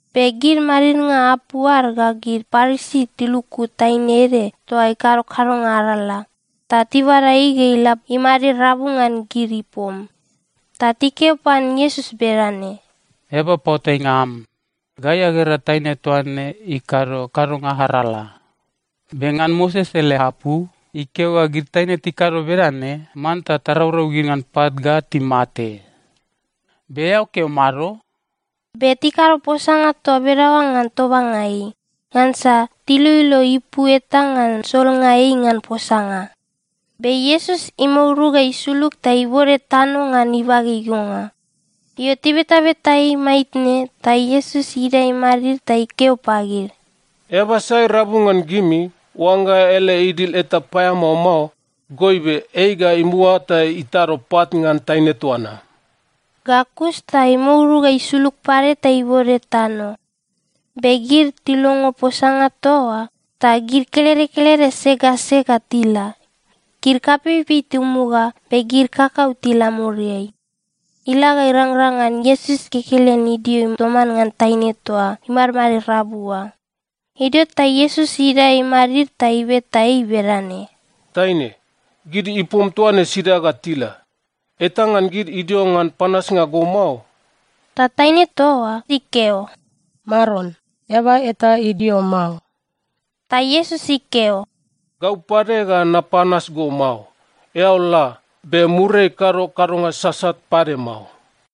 Be gid madidnga apu ad ga gid Parisi tiluku taine ede toa ikado kadonga arala, ta tibada ei ga ila imadid rabu ngan gid ipom. Ta tikeo pan Iesus bedane, “Eaba paoatainga am, gai agera taine toa ne ikado kadonga arala! Be ngan Moses ele apu, ikeo ga gid taine tikado bedane, manta taraurau gid ngan pat ga timate. Be eao keo mado?” Be tikado posanga toa bedaoa ngan tobanga ei, ngansa tiloilo ipu eta ngan solnga ei ngan posanga. Be Iesus imouru ga isulug, ta ibode tano ngan ibage igonga. Io, tibetabeta ei maitne, ta Iesus idae imadid ta ikeo pagid, “Eaba sai rabu ngan gimi, oangga ele idil eta paeamao mao, goibe ei ga imuga ta itado pat ngan taine toa na.” Ga kus ta imouru ga isulug pade ta ibode tano. Be gid tilongo posanga toa oa, ta gid kelede kelede sek ga sek ga tila. Gid kapeipei timuga, be gid kakau tila muriai. Ila ga irangrang ngan Iesus kekelen idio toman ngan taine toa imadmadid rabu oa. Idio ta Iesus idae imadid ta ibeta ei bedane, “Taine, gid ipom toa ne sida ga tila? Eta ngan gid idio ngan panasnga go mao?” Ta taine toa oa ikeo, “Maron, eaba eta idio mao.” Ta Iesus ikeo, “Gau pade ga napanas go mao. Eao la, be muriai kado kadonga sasat pade mao.”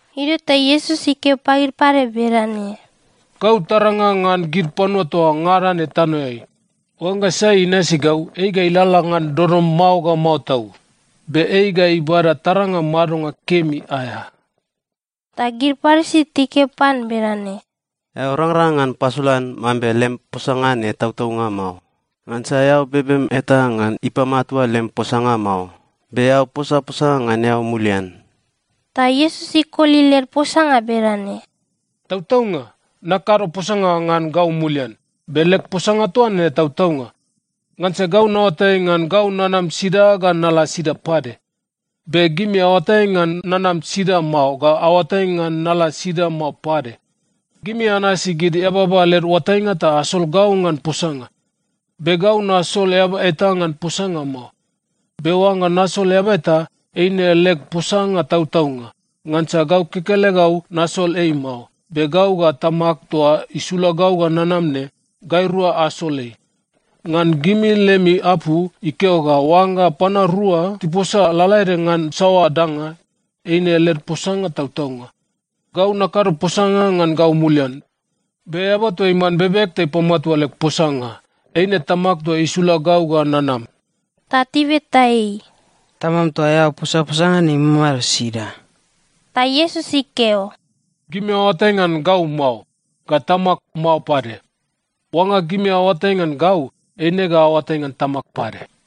Idio ta Iesus ikeo pagid pade bedane, “Gau taranga ngan gid panua toa ngada ne tanoeai. Oangga sai inasi gau, ei ga ilalala ngan dodom mao ga mao tau. Be ei ga ibada taranga madonga kemi aea.” Ta gid Parisi tikeo pan bedane, “Eao rangrang ngan pasolan mambe lem posanga ne tautaunga mao, ngansa eao bebem eta ngan ipamatua lem posanga mao, be eao posaposa ngan eao mulian.” Ta Iesus ikoli led posanga bedane, “Tautaunga, nakado posanga ngan gau mulian, be leg posanga toa ne tautaunga. Ngansa gau naoatai ngan gau nanam sida ga nala sida pade. Be gimi aoatai ngan nanam sida mao ga aoatai ngan nala sida mao pade. Gimi anasi gid eababa led oatainga ta asol gau ngan posanga. Be gau nasol eaba eta ngan posanga mao. Be oangga nasol eaba eta, eine leg posanga tautaunga, ngansa gau kekelegau nasol ei mao, be gau ga Tamag toa isula gau ga nanam ne, gairua asol ei. Ngan gimi lemi apu, ikeo ga oangga panua rua tiposa lalaede ngan saoa danga, eine led posanga tautaunga. Gau nakado posanga ngan gau mulian. Be eaba toa iman bebeg ta ipamatua leg posanga, eine Tamag toa isula gau ga nanam.” Ta tibeta ei, “Tamam toa eao posaposa ngan ne imamado sida?” Ta Iesus ikeo, “Gimi aoatai ngan gau mao, ga Tamag mao pade. Oangga gimi aoatai ngan gau, eine ga aoatai ngan Tamag pade.”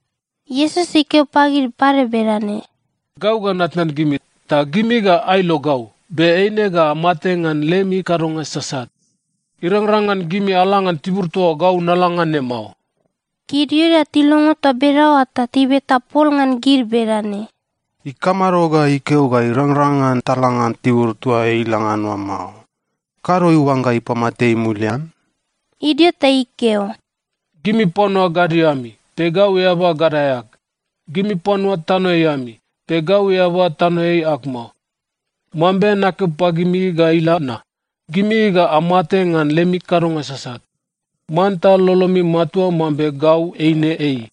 Iesus ikeo pagid pade bedane, “Gau ga natnan gimi, ta gimi ga ailo gau, be eine ga amate ngan lemi kadonga sasat. Irangrang ngan gimi ala ngan tibur toa gau nala ngan ne mao.” Gid Iuda tilongo toa bedaoa ta tibeta pol ngan gid bedane, “Ikamado ga ikeo ga irangrang ngan tala ngan tibur toa ei ila ngan oa mao? Kado iuangga ipamate ei mulian?” Idio ta ikeo, “Gimi panua gadio ami, be gau eaba gadae ag. Gimi panua tanoeai ami, be gau eaba tanoeai ag mao. Mambe nakeo pagimi ga ila na, gimi ga amate ngan lemi kadonga sasat. Manta lolomi matua mambe Gau eine Ei.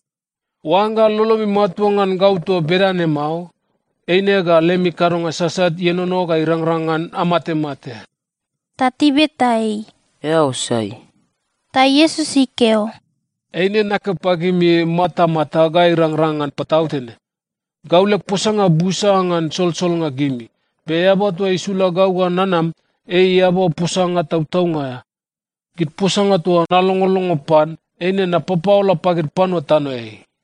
Oangga lolomi matua ngan gau toa bedane mao, eine ga lemi kadonga sasat ienono ga irangrang ngan amatemate.” Ta tibeta ei, “Eao sai?” Ta Iesus ikeo, “Eine nakeo pagimi matamata ga irangrang ngan patautene. Gau leg posanga busa ngan solsolnga gimi, be Eaba toa isula gau ga nanam, ei eaba posanga tautaunga aea. Gid posanga toa nalongolongo pan, eine napapaola pagid panua tanoeai.”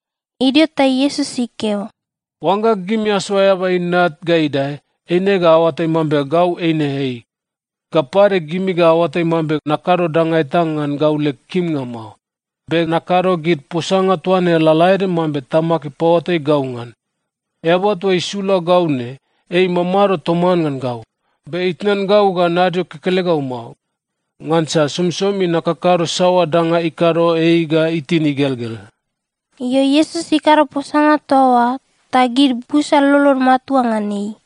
Idio ta Iesus ikeo, “Oangga gimi asoa Eaba Inat ga idae, eine ga aoatai mambe Gau eine Ei. Ga pade, gimi ga aoatai mambe nakado danga eta ngan gau leg kimnga mao, be nakado gid posanga toa ne lalaede mambe Tamag ipaoatai gau ngan. Eaba toa isula gau ne, ei imamado toman ngan gau, be itnan gau ga nadio kekelegau mao. Ngansa somisomi nakakado saoa danga ikado ei ga itin igelgel.” Io, Iesus ikado posanga toa oa, ta gid busa lolod matua ngan ei.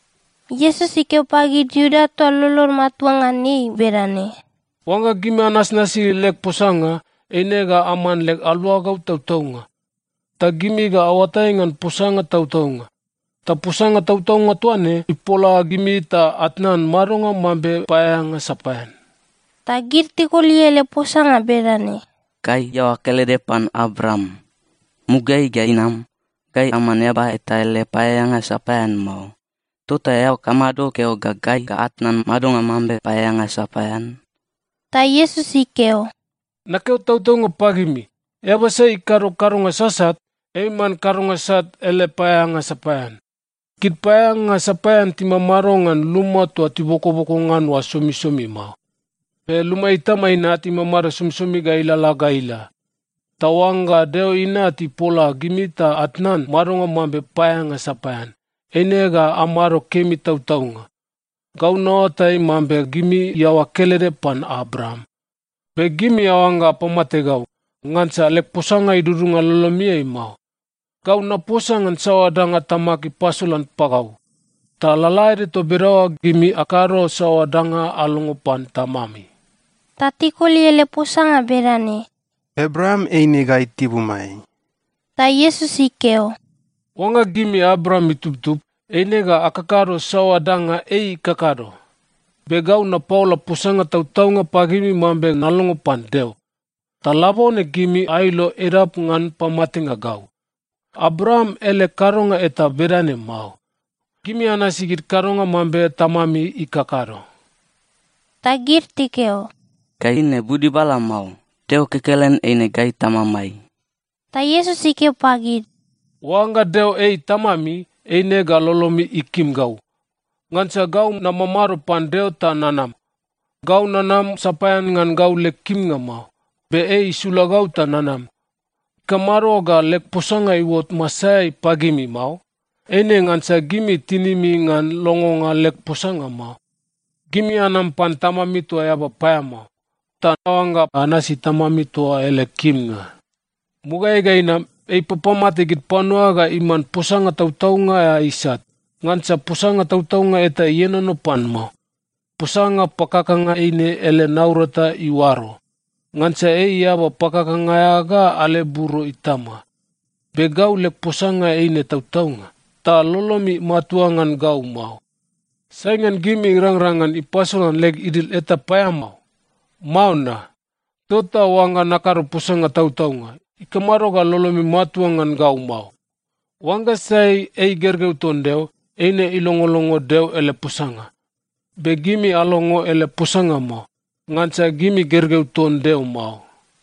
Iesus ikeo pagid Iuda toa lolod matua ngan ei bedane, “Oangga gimi anasnasi leg posanga, eine ga aman leg aluagau tautaunga. Ta gimi ga aoatai ngan posanga tautaunga, ta posanga tautaunga toa ne ipola gimi ta atnan madonga mambe paeaeanga sapaean.” Ta gid tikoli ele posanga bedane, “Gai iaoa kelede pan Abraam. Mugaeai ga inam, gai aman eaba eta ele paeaeanga sapaean mao. Tota eao kamado keo ga gai ga atnan madonga mambe paeaeanga sapaean?” Ta Iesus ikeo, “Nakeo tautaunga pagimi, eaba sai ikado kadonga sasat, ei iman kadonga sat ele paeaeanga sapaean. Gid paeaeanga sapaean timamado ngan luma toa tibokoboko ngan oa somisomi mao. Be luma itama inat imamado somisomi ga ilalala ga ila. Ta oangga Deo Inat ipola gimi ta atnan madonga mambe paeaeanga sapaean, eine ga amado kemi tautaunga. Gau naoatai mambe gimi iaoa kelede pan Abraam. Be gimi aoangga apamate gau, ngansa leg posanga idudunga lolomiai mao. Gau naposa ngan saoa danga Tamag ipasolan pagau. Ta lalaede toa bedaoa, gimi akado saoa danga alongo pan tamami.” Ta tikoli ele posanga bedane, “Abraam eine gai tibumai.” Ta Iesus ikeo, “Oangga gimi Abraam itubtub, eine ga akakado saoa danga ei ikakado. Be gau napaola posanga tautaunga pagimi mambe nalongo pan Deo. Ta labone gimi ailo edap ngan pamatenga gau. Abraam ele kadonga eta bedane mao. Gimi anasi gid kadonga mambe tamami ikakado.” Ta gid tikeo, “Gai ne budibala mao! Deo kekelen eine gai Tamamai!” Ta Iesus ikeo pagid, “Oangga Deo ei Tamami, eine ga lolomi ikim gau. Ngansa gau namamado pan Deo ta nanam. Gau nanam sapaean ngan gau leg kimnga mao, be ei isula gau ta nanam. Ikamado ga leg posanga iuot masaeai pagimi mao? Eine ngansa gimi tinimi ngan longonga leg posanga mao. Gimi anam pan tamami toa eaba paeamao, ta aoangga anasi tamami toa oa ele kimnga. Mugaeai ga inam, ei ipapamate gid panua ga iman posanga tautaunga aea isat. Ngansa posanga tautaunga eta ienono pan mao. Posanga pakakanga eine ele naurata iuaro. Ngansa ei eaba pakakanga aea ga aleburo itama. Be gau leg posanga eine tautaunga, ta lolomi matua ngan gau mao. Sai ngan gimi irangrang ngan ipasolan leg idil eta paeamao? Mao na? Tota oangga nakado posanga tautaunga, ikamado ga lolomi matua ngan gau mao? Oangga sai ei gergeu ton Deo, eine ilongolongo Deo ele posanga. Be gimi alongo ele posanga mao, ngansa gimi gergeu ton Deo mao.”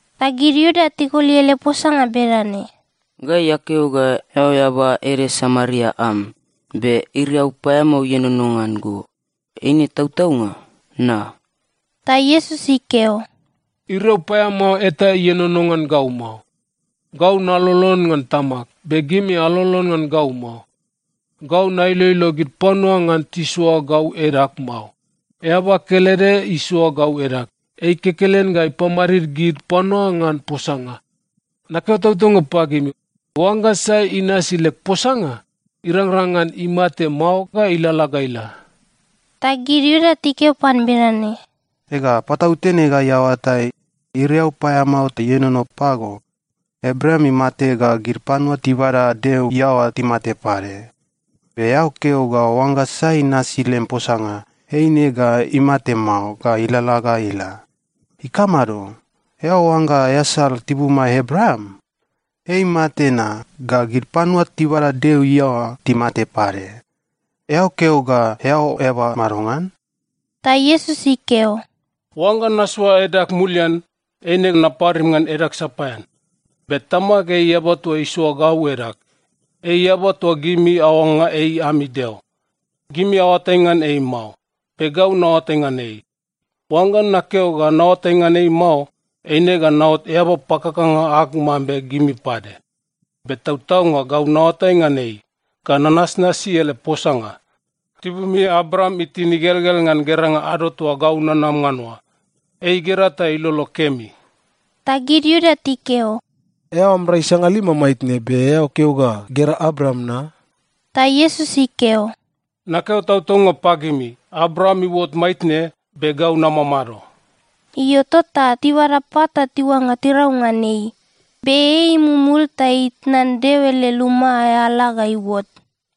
Ta gid Iuda tikoli ele posanga bedane, “Gai akeo ga eao eaba ede Samaria am, be iriau paeamao ienono ngan go, eine tautaunga, na?” Ta Iesus ikeo, “Iriau paeamao eta ienono ngan gau mao. Gau nalolon ngan Tamag, be gimi alolon ngan gau mao. Gau nailoilo gid panua ngan tisoa gau edag mao. Eaba kelede isoa gau edag. Ei kekelen ga ipamadid gid panua ngan posanga. Nakeo tautaunga pagimi, oangga sai inasi leg posanga, irangrang ngan imate mao ga ilalala ga ila.” Ta gid Iuda tikeo pan bedane, “Ega, patautene gai aoatai, iriau paeamao ta ienono pago! Abraam imate ga gid panua tibada Deo iaoa timate pade. Be eao keo ga oangga sai inasi lem posanga, eine ga imate mao ga ilalala ga ila. Ikamado? Eao oangga easal tibumai Abraam? Ei imate na, ga gid panua tibada Deo iaoa timate pade. Eao keo ga eao eaba madongan?” Ta Iesus ikeo, “Oangga nasoa edag mulian, eine naparim ngan edag sapaean. Be Tamag, ei Eaba toa isoa gau edag. Ei Eaba toa gimi aoangga ei ami Deo. Gimi aoatai ngan ei mao, be gau naoatai ngan ei. Oangga nakeo ga naoatai ngan ei mao, eine ga naot eaba pakakanga ag mambe gimi pade. Be tautaunga gau naoatai ngan ei, ga nanasnasi ele posanga. Tibumi Abraam itin igelgel ngan geranga ado toa gau nanama ngan oa. Ei igera ta ilolo kemi.” Ta gid Iuda tikeo, “Eao am rai sangalima maitne, be eao keo ga gera Abraam na?” Ta Iesus ikeo, “Nakeo tautaunga pagimi, Abraam iuot maitne, be Gau Namamado.” Io, tota tibada pat ta tiuangga tirau ngan ei, be ei imumul ta itnan Deo ele luma aea ala ga iuot.